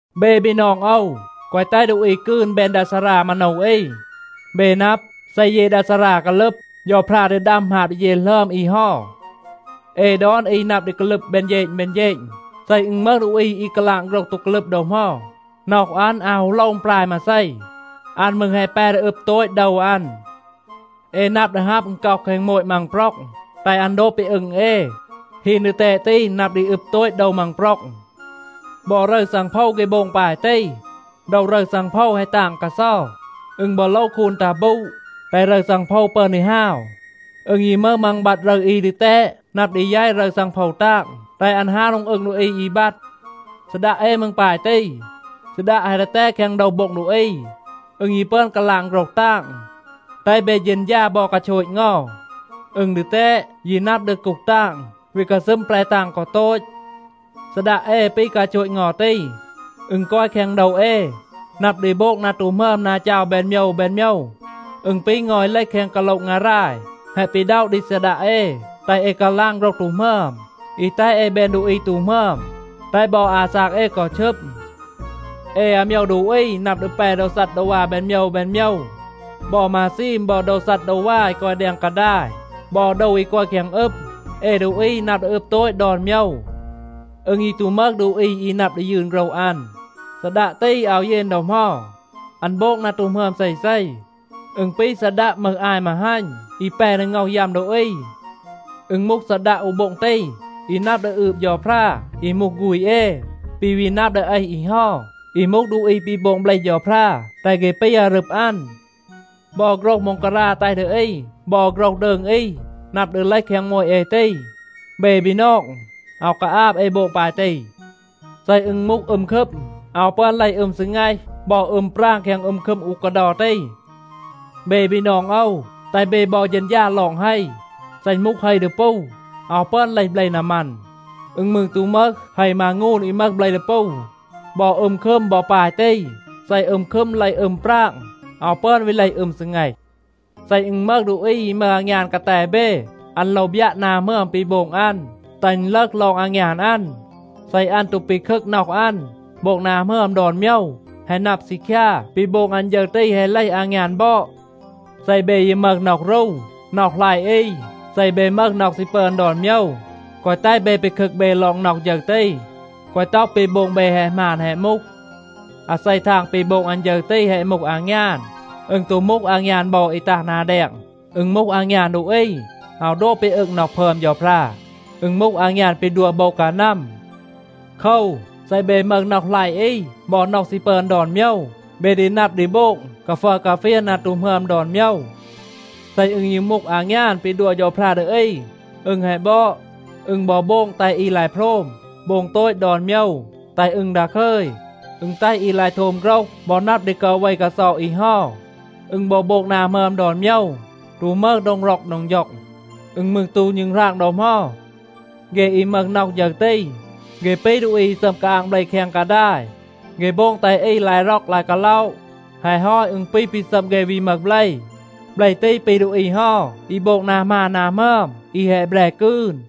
เบ บีนอง โอว, แกวะ แตห ดูอี กืน แบน ดา ซารา มาโนว อี. เบ นับ, เซ เย ดา ซารา กาลึบ, เฌาพรา ดี ดัม หมาบ ดี เย หลึอม อี เฮา. เอ ดอน อี นับ ดี กาลึบ แบน เฌณ แบน เฌณ. เซ อึณ มึห ดูอี อี กาลาง โฆรห ตู กาลึบ ดอ เหมา, น็อห อัน อาว ฮู โลว อึณปราย มาเซ. อัน มืร แฮะ แป ดี อึบ โตต โดว อัน. เอ นับ ดี ฮับ อึณก็อะ แคง โมต มังปร็อง, แตห อัน โดบ ปี อึง เอ. ฮีน ดีแตด ตี นับ ดี อึบ โตต โดว มังปร็อง. บอ รึร ซังโพว เฆ โบง ปาย ตี. โดว รึร ซังโพว แฮะ ตาง กาเซา. อึณ บอ โลว คูน ตัห บูด, แตห รึร ซังโพว ปึอน ดี ฮาว. อึณ ยี มึห มัง บัด รึร อี ดีแตด, นับ ดี แยต รึร ซังโพว ตาง แตห อัน ฮาว โดง อึง ดูอี อี บัด. ซีดัะ เอ มืร ปาย ตี. ซีดัะ แฮะ ดีแตด แคง โดว โบ็ง ดูอี. อึณ ยี ปึอน กาลาง โฆรห ตาง. แตห เบ เฌณฌา บอ กาโชต เงา. อึณ ดีแตด, ยี นับ ดี กูห ตาง, วี กาซึม แปร ตาง กอ โตต. ซีดัะ เอ ปี กาโชต เงา ตี. อึณ กอย แคง โดว เอ, นับ ดี โบง นา ตู หมึอม นา จาว แบน โมยว แบน โมยว. อึณ ปี เงา อี เลห แคง กาโละ งาราย แฮะ ปีด็อะ ดี ซีดัะ เอ, แตห เอ กาลาง โฆรห ตู หมึอม, อี แตห เอ แบน ดูอี ตู หมึอม, แตห บอ อาซาก เอ กอ ชึม. เอ อาโมยว ดูอี นับ ดี แป โดว ซัดดาวา แบน โมยว แบน โมยว. บอ มาซีม บอ โดว ซัดดาวา อี กอย แดง กาดาย บอ โดว อี กอย แคง อึม, เอ ดูอี นับ ดี อึบ โตต ดอน โมยว. อึณ ยี ตู มึห ดูอี อี นับ ดี ยืน โฆรห อัน. ซีดัะ ตี อาว เยน ดอ เหมา. อัน โบง นา ตู หมึอม เซเซ. อึณ ปี ซีดัะ มึห อาย มาฮัณ อี แป ดี ง็อห ยัม ดูอี. อึณ มูห ซีดัะ อู โบ็ง ตี, อี นับ ดี อืบ เฌาพรา อี มูห ฆูณ เอ, ปี วี นับ ดี เอห อี เฮา, อี มูห ดูอี ปี โบง เบลห เฌาพรา, แตห เฆ ปี อารึบ อัน. บอ โฆรห ม็องการา แตห ดี อี บอ โฆรห ดืง อี นับ ดี เลห แคง โมต เอ ตี. เบ บีนอง, อาว กาอาบ เอ โบง ปาย ตี. เซ อึณ มูห อึม คึม, อาว ปึอน เลห อึม ซีแงห บอ อึม ปราง แคง อึม คึม อู กาเดา ตี. เบ บีนอง โอว, แตห เบ บอ เฌณฌา ลอง เฮ. เซ อึณ มูห เฮ ดีปู, อาว ปึอน เลห เบล นามัน. อึณ มืร ตู มึห เฮ มางูน อี มึห เบล ดีปู. บอ อึม คึม บอ ปาย ตี. เซ อึม คึม เลห อึม ปราง, อาว ปึอน วี เลห อึม ซีแงห. เซ อึณ มึห ดูอี อี มึห อางยาน กาแต เบ, อัน โลว บยัะ นา หมึอม ปี โบง อัน, แตห อึณ ลึห ลอง อางยาน อัน. เซ อัน ตู ปีคึก น็อห อัน, โบง นา หมึอม ดอน โมยว, แฮะ นับ ซีคยา, ปี โบง อัน ฌึร ตี แฮะ เลห อางยาน บอด. เซ เบ ยี มึห น็อห รู, น็อห หลัยะ อี, เซ เบ มึห น็อห ซี ปึอน ดอน โมยว, แกวะ แตห เบ ปีคึก เบ ลอง น็อห ฌึร ตี. แกวะ ต็อห, ปี โบง เบ แฮะ หมาน แฮะ มูห. อาเซ ทาง ปี โบง อัน ฌึร ตี แฮะ มูห อางยาน, อึณ ตู มูห อางยาน บอด อี ตัห นา แดง. อึณ มูห อางยาน ดูอี, อาว โดบ ปี อึง น็อห พึอม เฌาพรา. อึณ มูห อางยาน ปี ดัว โบว กานัม. โคว, เซ เบ มึห น็อห หลัยะ อี บอ น็อห ซี ปึอน ดอน โมยว, เบ ดี นับ ดี โบง กาฟัร กาเฟียน นา ตู หมึอม ดอน โมยว. เซ อึณ ยี มูห อางยาน ปี ดัว เฌาพรา ดี อี, อึณ แฮะ บอด. อึณ บอ โบง แตห อี ลาย โพรม, โบง โตต ดอน โมยว, แตห อึณ ดาคึย. อึณ แตห อี ลาย โทม โฆรห บอ นับ ดี กาเว กาเซา อี เฮา. อึณ บอ โบง นา หมึอม ดอน โมยว, ตู มึห โดง ร็อก โดง ฌ็อง. อึณ มืร ตู ณึงราง ดอ เหมา. เฆ อี มึห น็อห ฌึร ตี, เฆ ปี ดูอี อี ซัม กาอาง เบล แคง กาดาย. เฆ โบง แตห อี ลาย ร็อก ลาย กาล็อะ. แฮะ ฮอต อึณ ปี ปี ซัม เฆ วี มึห เบล. เบล ตี ปี ดูอี เฮา อี โบง นา หมาน นา หมึอม, อี แฮะ แบร กืน.